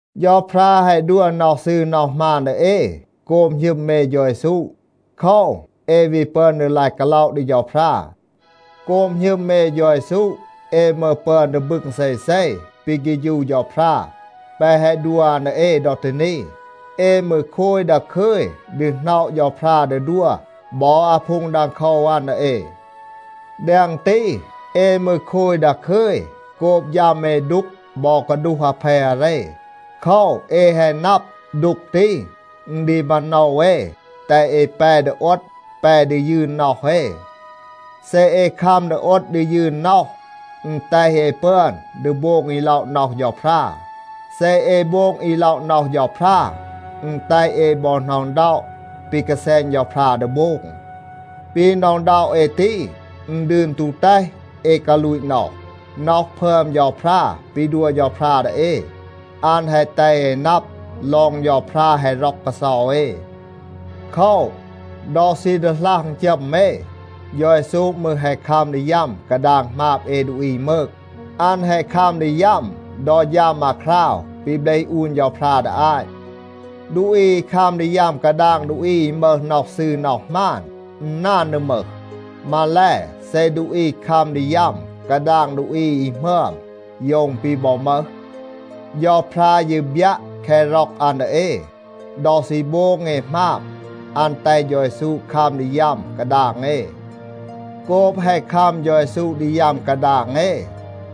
เฌาพรา แฮะ ดัว น็อห ซืร น็อห หมาน ดี เอ โกบ หณึม เอ เฌา เยซู. โคว, เอ วี ปึอน ดี ลาย กาล็อะ ดี เฌาพรา. โกบ หณึม เอ เฌา เยซู, เอ มืร ปึอน ดี บึง เซเซ ปี เฆฌู เฌาพรา แปะ แฮะ ดัว อัน ดี เอ ดอ ตี นี. เอ มืร โคย ดาคึย ดี หน็อะ เฌาพรา ดี ดัว บอ อาพูง ดังโคว อัน ดี เอ. แดง ตี, เอ มืร โคย ดาคึย โกบ ฌัม เอ ดูก บอ กาดูห อาเพ อาเร. โคว, เอ แฮะ นับ, ดูก ตี, อึณ ดี มาโนว เอ แตห เอ แป ดี โอด, แป ดี ยืน น็อห เอ. เซ เอ คัม ดี โอด ดี ยืน น็อห, อึณ แตห เอ ปึอน ดี โบง อี ล็อะ น็อห เฌาพรา. เซ เอ โบง อี ล็อะ น็อห เฌาพรา, อึณ แตห เอ บอ หน็อะ อึณด็อะ ปี กาแซณ เฌาพรา ดี โบง. ปี หน็อะ อึณด็อะ เอ ตี, อึณ ดืน ตู แตห เอ กาลูต น็อห. น็อห พึอม เฌาพรา ปี ดัว เฌาพรา ดี เอ, อัน แฮะ แตห เอ นับ ลอง เฌาพรา แฮะ ร็อก กาเซา เอ. โคว, ดอ ซี ดีหลัห อึณจัม เอ, เฌา เยซู มืร แฮะ คัม ดี ยัม กาดาง หมาบ เอ ดูอี มืก. อัน แฮะ คัม ดี ยัม ดอ ฌัม อาคราว ปี เบลห อูน เฌาพรา ดี อาต. ดูอี อี คัม ดี ยัม กาดาง ดูอี อี มึห น็อห ซืร น็อห หมาน, อึณ นาน ดี มึห. มาแล, เซ ดูอี คัม ดี ยัม กาดาง ดูอี อี หมึอม, โยว อึณ ปี บอ มึห. เฌาพรา ยี บยัะ แคะ ร็อก อัน ดี เอ. ดอ ซี โบง เอ หมาบ, อัน แตห เฌา เยซู คัม ดี ยัม กาดาง เอ. โกบ แฮะ คัม เฌา เยซู ดี ยัม กาดาง เอ,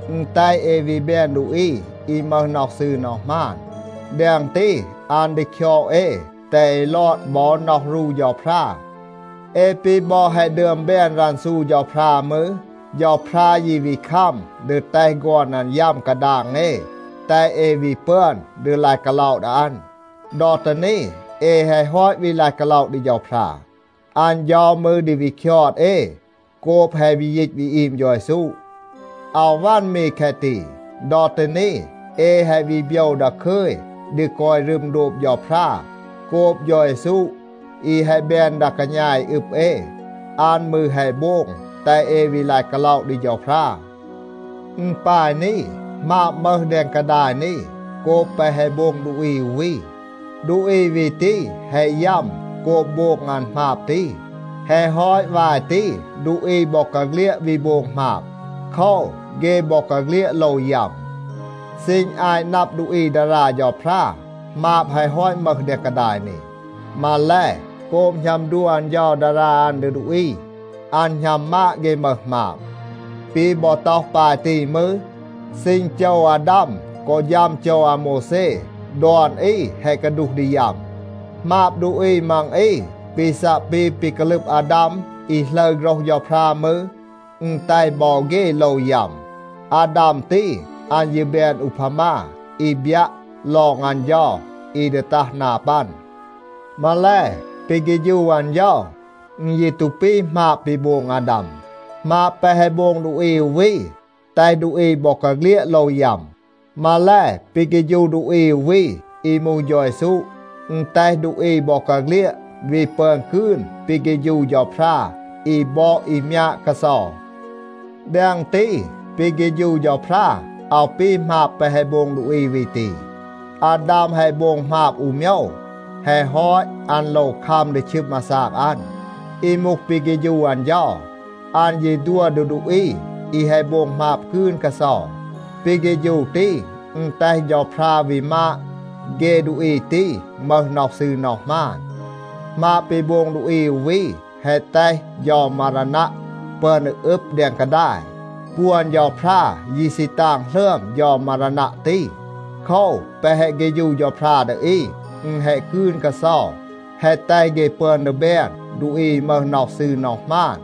อึณ แตห เอ วี แบน ดูอี อี มึห น็อห ซืร น็อห หมาน. แดง ตี, อัน ดี คยอด เอ แตห เอ ลอด บอ น็อห รู เฌาพรา. เอ ปี บอ แฮะ ดึอม แบน รันซู เฌาพรา มืร, เฌาพรา ยี วี คัม ดี แตห ฆอน อัน ยัม กาดาง เอ, แตห เอ วี ปึอน ดี ลาย กาล็อะ ดี อัน. ดอ ตี นี, เอ แฮะ ฮอต วี ลาย กาล็อะ ดี เฌาพรา, อัน เฌา มืร ดี วี คยอด เอ โกบ แฮะ วี ยีต วี อีม เฌา เยซู. อาว วัน มี แคะ ตี. ดอ ตี นี เอ แฮะ วี โบยว ดาคึย ดี กอย รึม โดบ เฌาพรา โกบ เฌา เยซู อี แฮะ แบน ดา กาณา อี อึบ เอ, อัน มืร แฮะ โบง แตห เอ วี ลาย กาล็อะ ดี เฌาพรา. อึณ ปาย นี. หมาบ มึห แดง กาดาย นี, โกบ แปะ แฮะ โบง ดูอี อู วี. ดูอี วี ตี แฮะ ยัม โกบ โบง อัน หมาบ ตี. แฮะ ฮอต วาย ตี, ดูอี บอกาเฆลียด วี โบง หมาบ. โคว, เฆ บอกาเฆลียด โลว ยัม. ซีณ อาต นับ ดูอี ดารา เฌาพรา, หมาบ แฮะ ฮอต มึห แดง กาดาย นี. มาแล, โกบ หณัม ดัว อัน เฌา ดารา อัน ดี ดูอี, อัน หณัม มาด เฆ มึห หมาบ. ปี บอ ต็อห ปาย ตี มืร, ซีณ โจว อาดาม กอ ฌัม โจว อาโมวแซ, ดอน อี แฮะ กาดูห ดี ยัม. หมาบ ดูอี มัง อี, ปี ซัะ ปี ปี กาลึบ อาดาม อี หลึร โฆรห เฌาพรา มืร, อึณ แตห บอ เฆ โลว ยัม. อาดาม ตี, อัน ยี แบน อูพามา อี บยัะ ลอง อัน เฌา อี ดี ตัห นา ปัน. มาแล, ปี เฆฌู อัน เฌา, อึณ ยี ตู ปี หมาบ ปี โบง อาดาม. หมาบ แปะ แฮะ โบง ดูอี อู วี, แตห ดูอี บอกาเฆลียด โลว ยัม. มาแล, ปี เฆฌู ดูอี อู วี อี มูห เฌา เยซู, อึณ แตห ดูอี บอกาเฆลียด วี ปึอน กืน ปี เฆฌู เฌาพรา อี บอด อี มยาด กาเซา. แดง ตี, ปี เฆฌู เฌาพรา อาว ปี หมาบ แปะ แฮะ โบง ดูอี วี ตี. อาดาม แฮะ โบง หมาบ อู โมยว. แฮะ ฮอต, อัน โลว คัม ดี ชึม อาซาก อัน. อี มูห ปี เฆฌู อัน เฌา, อัน ยี ดัว ดี ดูอี อี แฮะ โบง หมาบ กืน กาเซา. ปี เฆฌู ตี, อึณ แตห เฌาพรา วี มาด เฆ ดูอี ตี มึห น็อห ซืร น็อห หมาน. หมาบ ปี โบง ดูอี อู วี, แฮะ แตห เฌา มารานัะ ปึอน ดี อึบ แดง กาดาย. ปวน เฌาพรา ยี ซี ตาง หลึอม เฌา มารานัะ ตี. โคว, แปะ แฮะ เฆฌู เฌาพรา ดี อี, อึณ แฮะ กืน กาเซา, แฮะ แตห เฆ ปึอน ดี แบน ดูอี อี มึห น็อห ซืร น็อห หมาน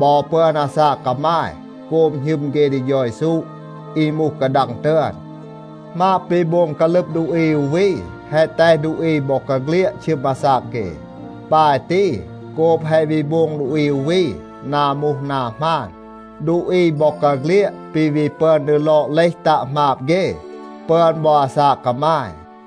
บอ ปึอน อาซาก กามาย โกบ หณึม เฆ ดี เฌา เยซู อี มูห กาดัง ตึอน. หมาบ ปี โบง กาลึบ ดูอี อู วี, แฮะ แตห ดูอี บอกาเฆลียด ชึม อาซาก เฆ. ปาย ตี, โกบ แฮะ วี โบง ดูอี อู วี นา มูห นา หมาน, ดูอี บอกาเฆลียด ปี วี ปึอน ดี ลอด เลห ตัะ หมาบ เฆ, ปึอน บอ อาซาก กามาย.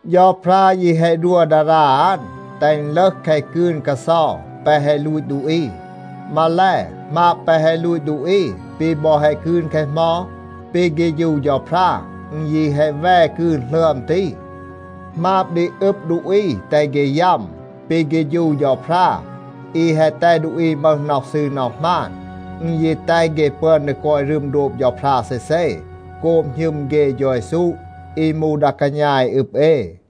เฌาพรา ยี แฮะ ดัว ดารา อัน, แตห อึณ ลึห แคะ กืน กาเซา แปะ แฮะ ลูต ดูอี. มาแล, หมาบ แปะ แฮะ ลูต ดูอี ปี บอ แฮะ กืน แคะ เหมา, ปี เฆฌู เฌาพรา อึณ ยี แฮะ แว กืน หลึอม ตี. หมาบ ดี อึบ ดูอี แตห เฆ ยัม. ปี เฆฌู เฌาพรา อี แฮะ แตห ดูอี มึห น็อห ซืร น็อห หมาน, อึณ ยี แตห เฆ ปึอน ดี กอย รึม โดบ เฌาพรา เซเซ โกบ หณึม เฆ เฌา เยซู อี มูห ดา กาณา อี อึบ เอ.